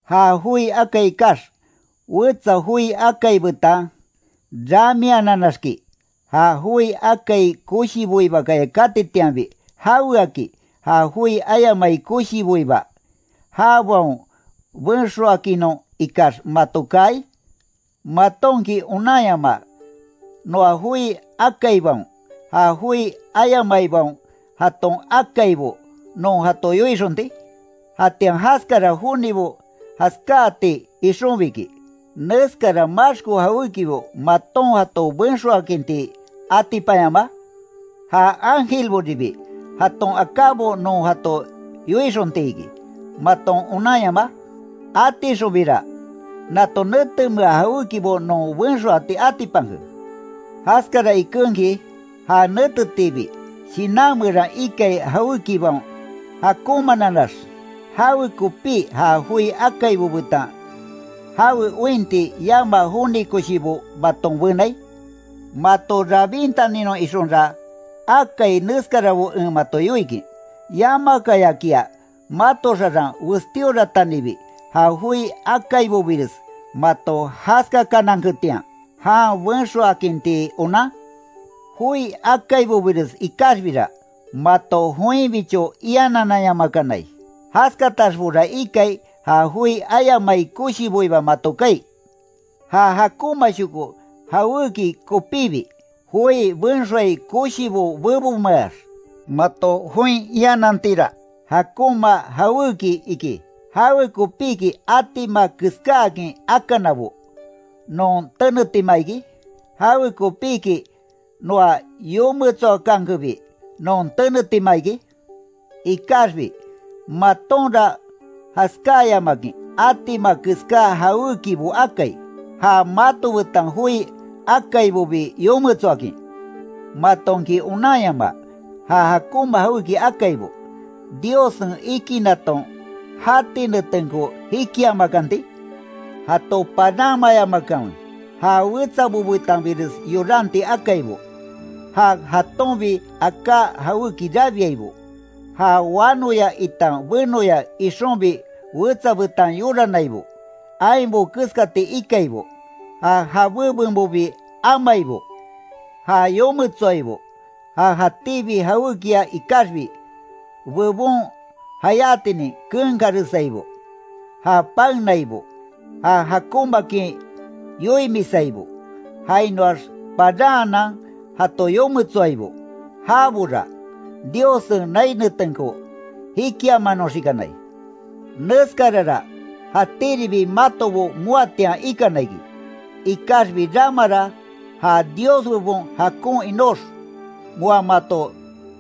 Ja joi akai ikax, wetsa joi akai betan ramiananaxki ¿Ja joi akai koshiboibakaya katitianbi, jaweaki ja joi ayamai koshiboiba, jabaon benxoakinnon ikax, mato kaai? ¿Matonki onanyamaa, noa joi akaibaon, ja joi ayamaibaon jaton akaibo non jato yoixonti? Jatian jaskara jonibo jaskáati ixonbiki, ¿Neskara maxko jawékibo maton jato benxoakinti atipanyamaa? ¿Ja ángelboribi jaton akábo non jato yoixontiki, maton onanyamaa? Atixonbira, nato netemea jawékibo non benxoati atipanke. Jaskara ikenki, ja netetiibi, shinan meran ikai jawékibaon jakonmananax ¿Jawekopí ja joi akaibo betan jawe ointi yamaa joni koshibo maton benai? Mato rabintaninon ixonra, akai neskarabo en mato yoikin ¿Yamakayakia mato xaran westíoratanibi, ja joi akaibobires mato jaskakananketian, jan benxoakinti onan? Joi akaibobires ikaxbira, mato joinbicho ianananyamakanai, jaskataxbora ikai, ja joi ayamai koshiboiba mato kaai. Ja jakonmashoko jawéki kopíbi, joi benxoai koshibo bebonmeax mato join ianantira, jakonma jawéki iki, ¿Jawekopíki atima keskáakin akanabo, non tenetima iki? ¿Jawekopiki noa yometsoakankenbi, non tenetima iki? Ikaxbi, matonra jaskáyamakin atima keská jawékibo akai, ja mato betan joi akaibobi yometsoakin. ¿Matonki onanyamaa, ja jakonma jawéki akaibo, Diossen ikinaton jati netenko jikiamakanti? Jato paranmayamakanwe, ja wetsabo betanbires yoranti akaibo, ja jatonbi aká jawéki rabiaibo, ja wanoya itan benoya ixonbi wetsa betan yoranaibo, ainbo keskati ikaibo, ja jabé benbobi amaibo. Ja yometsoaibo, ja jatíbi jawékia ikaxbi, bebon jayátinin kenkaresaibo, ja paenaibo, ja jakonmaakin yoimisaibo, jainoax paranhanan jato yometsoaibo, jabora, Diossen nai netenko jikiamanoxikanai. Neskarara jatíribi matobo moatian ikana iki, ikaxbi ramara ja Dios bebon jakon inox, moa mato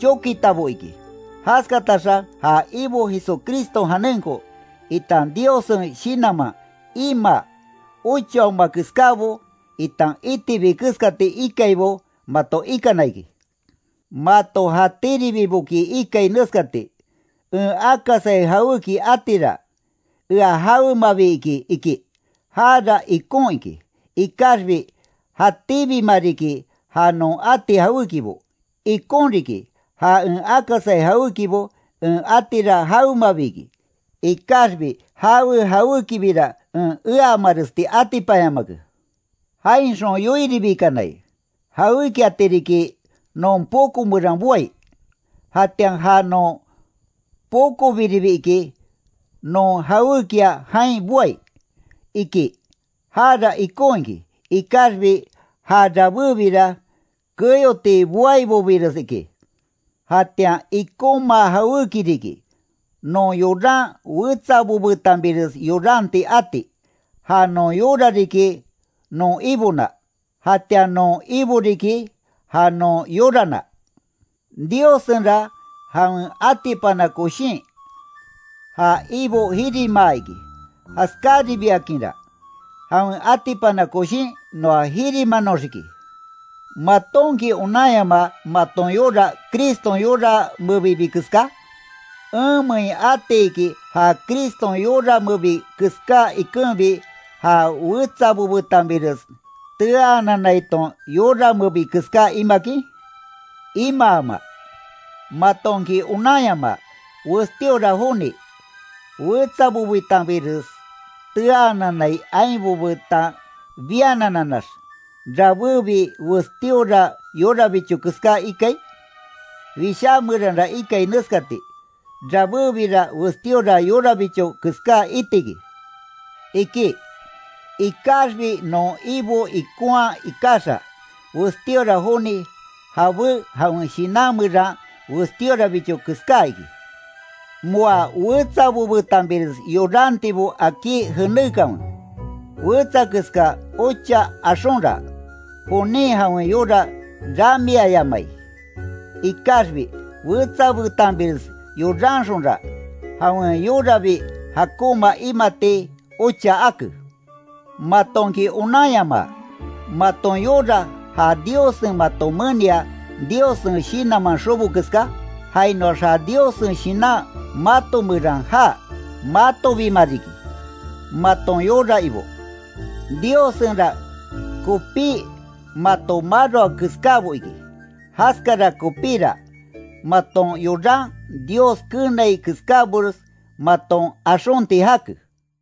chokitabo iki. Jaskataxa ja Ibo Jesucriston janenko, itan Diossen Shinanman, imaa, ochaoma keskábo, itan itibi keskati ikaibo mato ikana iki. Mato jatíribiboki ikai neskati: “En akasai jawéki atira, ea jawemabi iki”, iki. Jara ikon iki, ikaxbi jatíbima riki, ja non ati jawékibo. Ikon riki, ja en akasai jawékibo en atira jawemabi, ikaxbi jawe jawékibira en eamaresti atipanyamake. Jainxon yoiribikanai: “Jawékiati riki, non poko meran boai, jatian ja non pokobiribi iki, non jawékia jain boai”, iki. Jara ikon iki, ikaxbi ja rabébira keyoti boaibobires iki. Jatian ikonma jawéki riki, non yoran wetsabo betanbires yoranti ati, ja non yora riki non Ibona, jatian non Ibo riki, ja non yorana. Diossenra jawen atipana koshin, ja Ibo jirimaa iki. Jaskáribiakinra, jawen atipana koshin noa jirimanoxiki. ¿Matonki onanyamaa maton yora Criston yora mebibi keská? ¿Enmein atiki ja Criston yora mebi keská ikenbi ja wetsabo betanbires teaananaiton yora mebi keská imakin? Imaama. ¿Matonki onanyamaa, westíora joni, wetsabo betanbires teaananai ainbo betan bianananax, rabébi westíora yorabicho keská ikai? Wishá meranra ikai neskati: “Rabébira westíora yorabicho keská itiki”, iki. Ikaxbi non Ibo ikonhaa ikaxa, westíora joni jabé jawen shinan meran westíorabicho keská iki. Moa wetsabo betanbires yorantibo akí jenékanwe, wetsa keska ocha axonra, jonin jawen yora ramiayamai. Ikaxbi wetsa betanbires yoranxonra, jawen yorabi jakonma imati ocha ake. ¿Matonki onanyamaa, maton yora ja Diossen mato menia Diossen Shinanman xobo keska, jainoax ja Diossen Shinan mato meran jaa? Matobima riki, maton yora ibo. Diossenra kopí mato maroa keskábo iki, jaskara kopíra, maton yoran Dios keenai keskábores maton axonti jake.